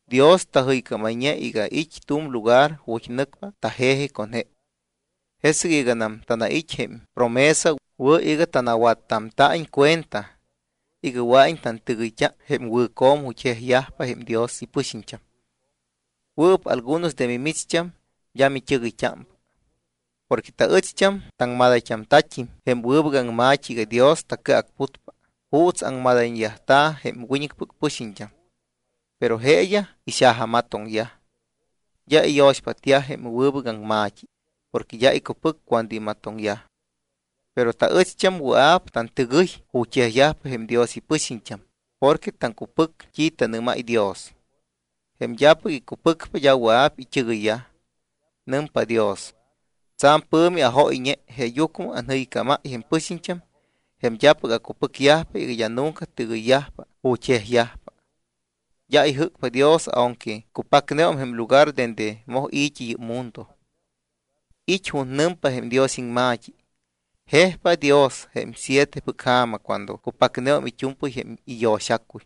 Dios tajɨycámayñe iga it́ tu̱m lugar ju̱t́ nɨcpa taje̱ji con je. Jesɨc iganam tanait́ jém promesa, wɨ̱ iga tanawattamta̱iñ cuenta iga wɨa̱iñ iñt́ɨgɨyt́a jém wɨ̱co̱m ju̱t́ jejyajpa jém Dios ipɨxiñt́am. Wɨɨp algunos de mimicht́am d́a mit́ɨgɨyt́ámpa. Porque taɨcht́am taŋmadayt́amta̱t́im jém wɨbɨc aŋma̱t́i iga Dios tacɨacputpa juuts aŋmadayyajta̱ jém wiñɨcpɨc pɨxiñt́am. Pero jeeyaj ixajamatoŋyaj, d́a iyo̱xpátyaj jém wɨbɨc aŋma̱t́i porque d́a icupɨcyaj cuando imatoŋyaj. Pero taɨcht́am wɨa̱p tantɨgɨy ju̱t́ jejyajpa jém Dios ipɨxiñt́am porque taŋcupɨc t́i tanɨ́máy Dios. Jém d́apɨc icupɨcpa d́a wɨa̱p it́ɨgɨyyaj. Nɨmpa Dios: Tsa̱m pɨ̱mi ajóyñe jeeyucmɨ anjɨycámáy jém pɨxiñt́am jém d́apɨc acupɨcyajpa iga d́a nunca tɨgɨyyajpa ju̱t́ jejyajpa. D́a ijɨ́cpa Dios aunque cupacneum jém lugar dende moj i̱t́i yɨ́p mundo. It́ ju̱t́ nɨmpa jém Dios iŋma̱t́i: Jejpa Dios jém sietepɨc ja̱ma cuando cupacneum it́u̱mpɨy jém iyo̱xacuy.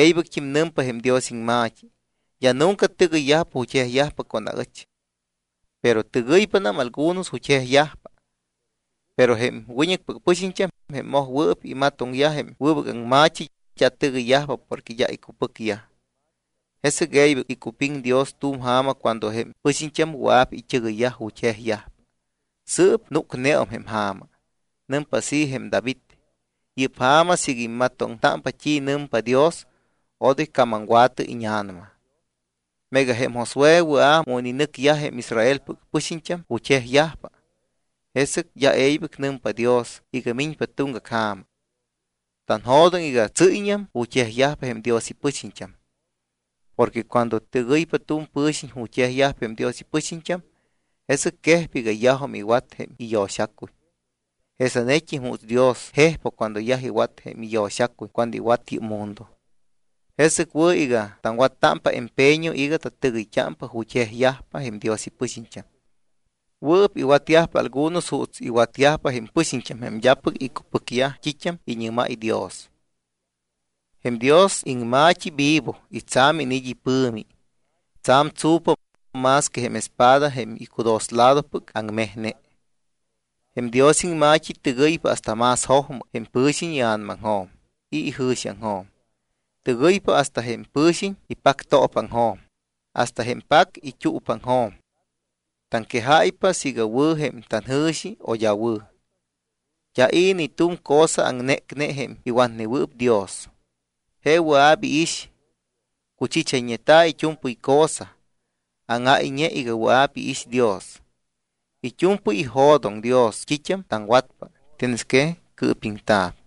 E̱ybɨct́im nɨmpa jém Dios iŋma̱t́i: D́a nunca tɨgɨyyajpa ju̱t́ jejyajpa con aɨch. Pero tɨgɨypanam algunos ju̱t́ jejyajpa. Pero jém wiñɨcpɨc pɨxiñt́am, jém mojwɨɨp imatoŋyaj jém wɨbɨc aŋma̱t́i, d́a tɨgɨyyajpa porque d́a icupɨcyaj. Jesɨc e̱ybɨc icupiŋ Dios tu̱m ja̱ma cuando jém pɨxiñt́am wɨa̱p it́ɨgɨyyaj ju̱t́ jejyajpa. Sɨɨp núcneum jém ja̱ma. Nɨmpa así jém David: Yɨ́p ja̱ma siiga immatoŋtámpa t́i nɨmpa Dios, odoy camamwa̱tɨ íña̱nama. Meega jém Josué wɨa̱ mu ininɨcyaj jém Israelpɨc pɨxiñt́am ju̱t́ jejyajpa, jesɨc d́a e̱ybɨc nɨmpa Dios iga miñpa tuŋgac ja̱ma. Tanjo̱doŋ iga tsɨ́yñam ju̱t́ jejyajpa jém Dios ipɨxiñt́am. Porque cuando tɨgɨypa tu̱m pɨ̱xiñ ju̱t́ jejyajpa jém Dios ipɨxiñt́am, jesɨc quejpa iga yajum iwat jém iyo̱xacuy jesanet́im juuts Dios jejpa cuando yaj iwat jém iyo̱xacuy cuando iwat yɨ́p mundo. Jesɨc wɨ̱ iga taŋwattámpa empeño iga tatɨgɨyt́ámpa ju̱t́ jejyajpa jém Dios ipɨxiñt́am. Wɨɨp iwatyajpa algunos juuts iwatyaj jém pɨxiñt́am jém d́apɨc icupɨcyaj t́it́am iñɨ́máy Dios. Jém Dios iŋma̱t́i vivo y tsa̱m iniit́ ipɨ̱mi. Tsa̱m tsu̱pa, más que jém espada jém icudosladopɨc aŋmejne. Jém Dios iŋma̱t́i tɨgɨypa hasta más jojmɨ jém pɨ̱xiñ ia̱namaŋjo̱m y ijɨ̱xiaŋjo̱m. Tɨgɨypa hasta jém pɨ̱xiñ ipacto̱paaŋjo̱m hasta jém pac it́uupaaŋjo̱m. Taŋquejáypa siiga wɨ̱ jém tanjɨ̱xi o d́a wɨ̱. D́a i̱ ni tu̱m cosa aŋnécne jém iwatnewɨɨp Dios, je wɨa̱p iix. Cuchichayñeta̱ it́u̱mpɨy cosa, áŋáyñe iga wɨa̱p iix Dios. It́u̱mpɨy ijo̱doŋ Dios t́it́am taŋwatpa, tienes que cɨɨpiŋta̱p.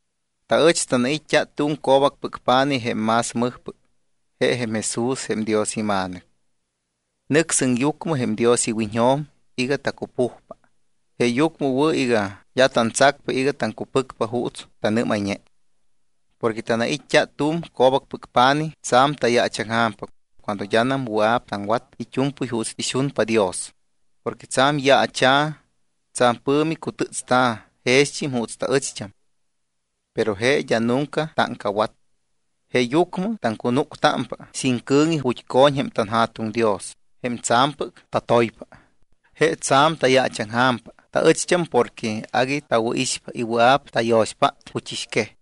Taɨch tanait́t́a tu̱m co̱bacpɨc pa̱nij jém más mɨjpɨc, je jém Jesús jém Dios iMa̱nɨc. Nɨc sɨŋyucmɨ jém Dios iwiñjo̱m iga tacupujpa. Jeeyucmɨ wɨ̱ iga d́a tantsacpa iga taŋcupɨcpa juuts tannɨ́mayñe. Porque tanait́t́a tu̱m co̱bacpɨc pa̱nij tsa̱m tayaachaŋja̱mpa cuando d́anam wɨa̱p taŋwat it́u̱mpɨy juuts ixunpa Dios, porque tsa̱m yaacha̱, tsa̱m pɨ̱mi cutɨ́tsta̱ jext́im juuts taɨcht́am, pero je d́a nunca táŋcawat. Jeeyucmɨ taŋcunúctámpa sin cɨ̱ŋi ju̱t́ co̱ñ jém tanJa̱tuŋ Dios, jém tsa̱mpɨc tatoypa. Je tsa̱m tayaachaŋja̱mpa taɨcht́am porque agui tawɨ̱ixpa y wɨa̱p tayo̱xpát juchɨxquej.